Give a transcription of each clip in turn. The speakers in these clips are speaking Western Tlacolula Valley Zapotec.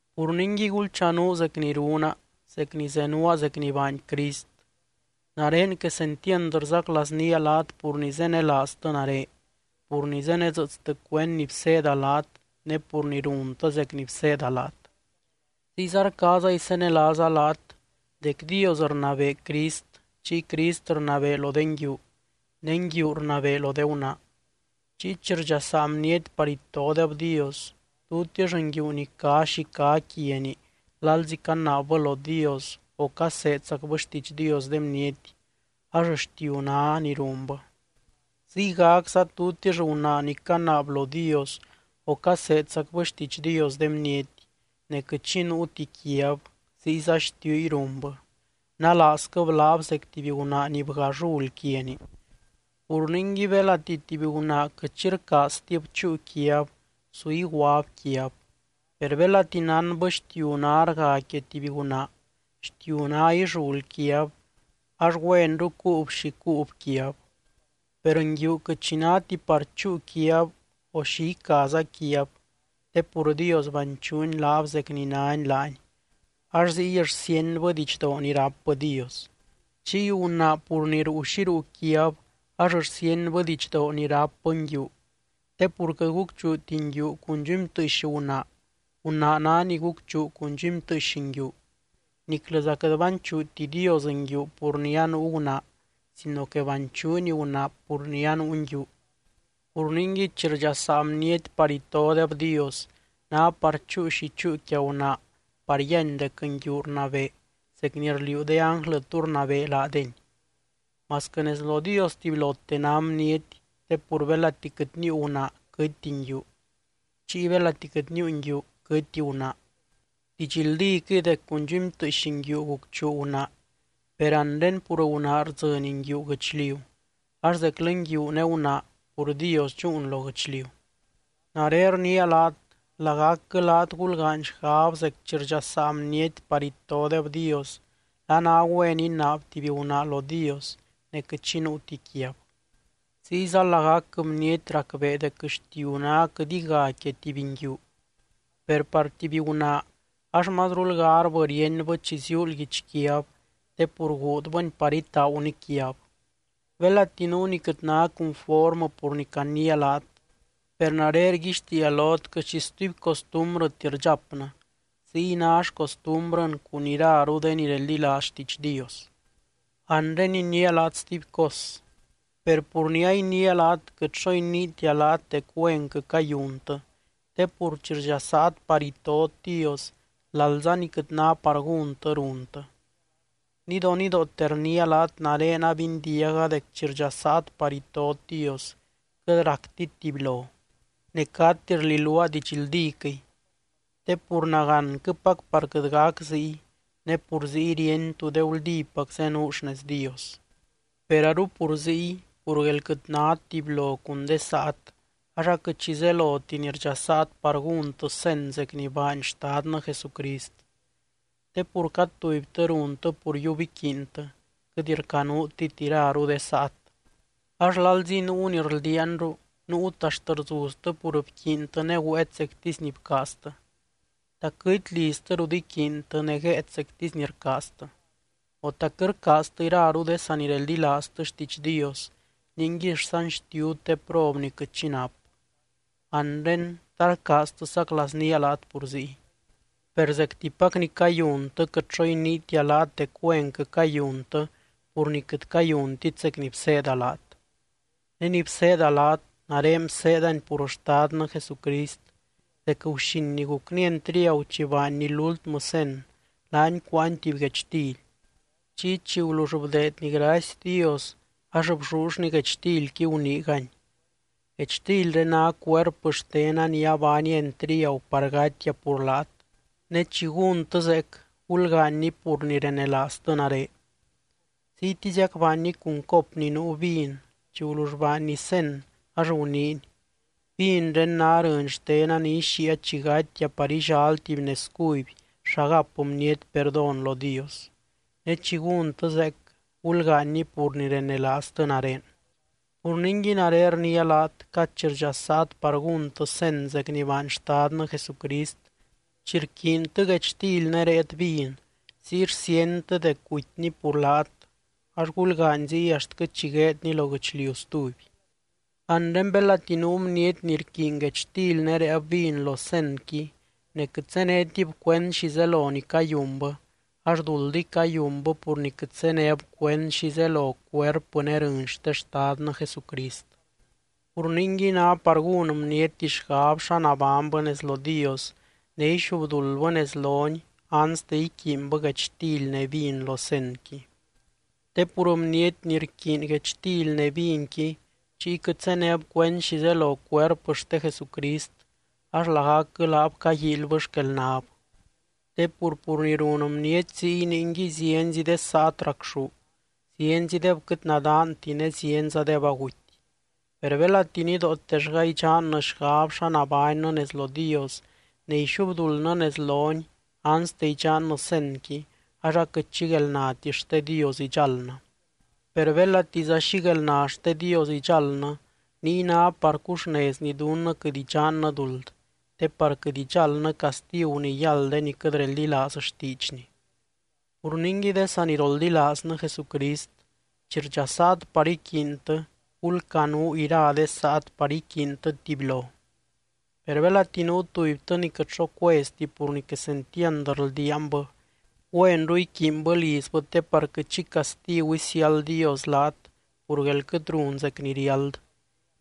Pur ningui gulchanuu zec ni runa, zec ni zenuaa zec ni baany Crist. Nare quesentiand rzaclaaznía laat pur ni zenelaaztɨ nare, pur ni zenedzɨɨtstɨ cuend ni bseeda laat ne pur ni runtɨ zec ni bseeda laat. Ziyza rcaaza isenelaaza laat dec Dios rnabee Crist chiy Crist rnabee lo de nguiu ne nguiu rnabee lo de gunaa. Chiy chi rdxasaa bniety par itodeb Dios, tutix nguiu ni cá xi cá quiani lalzi canaabbɨ lo Dios o caseedzacbɨ xtiidx Dios de bniety, ax xtiu ná ni runbɨ. Ziygacza tutix gunaa ni canaab lo Dios o caseedzacbɨ xtiidx Dios de bniety, ne quɨt xi nuuti quiab, ziyza xtiuy runbɨ. Nalaazquɨb laab zec tuby gunaa ni bga llul quiani. Pur ningui belati tuby gunaa quɨt xi rcaaztib chúu quiab, su iguab quiab. Per belati nánbɨ xtiu ná rga quia tuby gunaa, xtiu ná illul quiab, ax güenru cuub xi cuub quiab. Per nguiu quɨt xi náti par chúu quiab o xi icaza quiab te pur Dios banchuuny laab zec ni nány laany, ax ziy rsíenbɨ didxdoo ni rápbɨ Dios. Chiy gunaa pur ni ruu xi ruu quiab, ax rsíenbɨ didxdoo ni rápbɨ nguiu. Te pur quɨt gucchuuti nguiu cun dxumytɨɨx gunaa, gunaa ná ni gucchuu cun dxumytɨɨx nguiu. Niclɨza quɨt banchuuti Dios nguiu pur ni anuu gunaa sino que banchuuny gunaa pur ni anuu nguiu. Pur ningui chi rdxasaa bniety par itodeb Dios, ná par chúu xi chúu quia gunaa par yíany dec nguiu rnabee zec ni rliuu de ánglɨ tú rnabee laadeny. Masquɨ nez lo Dios tubylote ná bniety, te pur belati quɨt níiu gunaa quɨtti nguiu, chiy belati quɨt níiu nguiu quɨtti gunaa. Didxldíquɨy dec cun dxumytɨɨx nguiu gucchuu gunaa per anre pur gunaa rdzɨny nguiu guɨchliu, ax zeclɨ nguiu ne gunaa pur Dios dxúun lo guɨchliu. Nare rniia laat, lagacquɨ laat gulgaany xgab zec chi rdxasaa bniety par itodeb Dios, la ná güen inaab tuby gunaa lo Dios ne quɨt xi nuuti quiab. Ziyza lagacquɨ bniety racbee dec xtiu ná quɨt iga quia tuby nguiu. Per par tuby gunaa ax mazrul garbɨ ríenbɨ chi ziuul guichquiab, te pur guudbɨni par itaaguni quiab. Belati nuu ni quɨt ná cunformɨ pur ni caniia laat, per nare rguixtiia lot quɨt xi stuby costumbrɨti rdxapnɨ, ziy ná xcostumbrɨn cun iraru de ni reldilaaz xtiidx Dios. Anre iniia laat stuby cos, per pur ni a iniia laat quɨt xo iniitia laat dec güenquɨ cayuntɨ te pur chi rdxasaat par itot Dios, lalza ni quɨt ná par gúntɨ runtɨ. Nidonidoote rniia laat nare abindiaga dec chi rdxasaat par itot Dios quɨt ractit tubylo, ne cati rliluaa didxldíquɨy. Te pur nagánquɨpac par quɨt gac ziy, ne pur ziy ríeny tú de guldípac zenuu xnez Dios. Per aru pur ziy, pur guél quɨt nát tubylo cun de saat ax aquɨt xi zeloti ni rdxasaat par gúntɨ cen zec ni baany Xtadnɨ Jesucrist. Te pur cad tubytɨ runtɨ pur yiub iquiintɨ, quɨt rcanuutit iraru de saat. Ax lalzi nuu ni rldiaanru, nuut axt rzuztɨ pur ni bquiintɨ ne güéet zectisy ni bcaaztɨ. ¿Ta quɨt liztɨ rut iquiintɨ ne guéet zectisy ni rcaaztɨ? O, ¿ta quɨt rcaaztɨ iraru de sanireldilaaztɨ xtiidx Dios ningui rsanxtiut de prob ni quɨt xi nap? Anre, ¿ta rcaaztɨ saclaaznía laat pur ziy? ¡Per zectipac ni cayuntɨ, quɨt xo iniitia laat dec güenquɨ cayuntɨ, pur ni quɨt cayuntit zec ni bseeda laat! Ne ni bseeda laat, nare bseedani pur Xtadnɨ Jesucrist dec guxin ni gucny entriagu chi baanny lúltmɨ cen, laany cuáany tuby guechtily. Chiy chi gulull bdeedny gracy Dios ax bllullny guechtilqui, guniigany: “Guechtilré ná cuerpɨ xtena ni abaania entriagu par gatia pur laat. Ne chi gúntɨ zeec, gulgaanyni pur ni renelaaztɨ nare.” Ziytiziac baanny cun cop ni nuu vin chi gulull baanny cen, ax guniiny: “Vinré ná rɨny xtena ni ixíia chi gatia par illal tuby nez cuby xa gap bniety perdón lo Dios. Ne chi gúntɨ zeec, gulgaanyni pur ni renelaaztɨ nare.” Pur ningui nare rniia laat, cad chi rdxasaat par gúntɨ cen zec ni baany Xtadnɨ Jesucrist, chi rquiintɨ guechtily ne réet vin, ziy rsíentɨ dec gutyny pur laat ax gulgaany ziy axtquɨ chi gueedny lo guɨchliu stuby. Anre belati nuu bniety ni rquiiny guechtily ne réeb vin lo cenqui ne quɨt zénetib cuend xi zelo ni cayunbɨ, ax duldiy cayunbɨ pur ni quɨt zéneb cuend xi zelo cuerpɨ ne rɨny xte Xtadnɨ Jesucrist. Pur ningui ná par gún bniety xgab xa nabánybɨ nez lo Dios ne ixubduldbɨ nez lony anste iquiinbɨ guechtily ne vin lo cenqui. Te pur bniety ni rquiiny guechtily ne vinqui chiy quɨt zéneb cuend xi zelo cuerpɨ xte Jesucrist, ax lagacquɨ laab caguíilybɨ xquelnab. Te pur, pur ni run bniety ziy ningui zienzi de saat racxú, zienzideb quɨt nadaanti ne zienzadeb aguty. Per belati nidootellga idxannɨ xgab xa nabánnɨ nez lo Dios ne ixubduldnɨ nez lony anste idxannɨ cenqui ax aquɨt xi guelnati xte Dios idxáldnɨ. Per belatiza xi guelna xte Dios idxáldnɨ, niy ná par cuxnezny dunnɨ quɨt idxannɨ duld, te par quɨt idxáldnɨ castigu ni yáld de ni quɨt reldilaaz xtiidxny. Pur ningui de saniroldilaaznɨ Jesucrist, chi rdxasaat par iquiintɨ, gulcanuu ira de saat par iquiintɨ tubylo. Per belati nuu tubytɨ ni quɨt xo cueztib pur ni quesentiand rldiaanbɨ, güenru iquiinbɨ lizbɨ te par quɨt xi castigu isiáld Dios laat pur guél quɨt run zec ni riáld.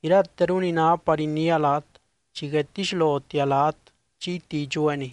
Irateru ni ná par iniia laat, chi guedtixlotia laat chiyti idxueeniy.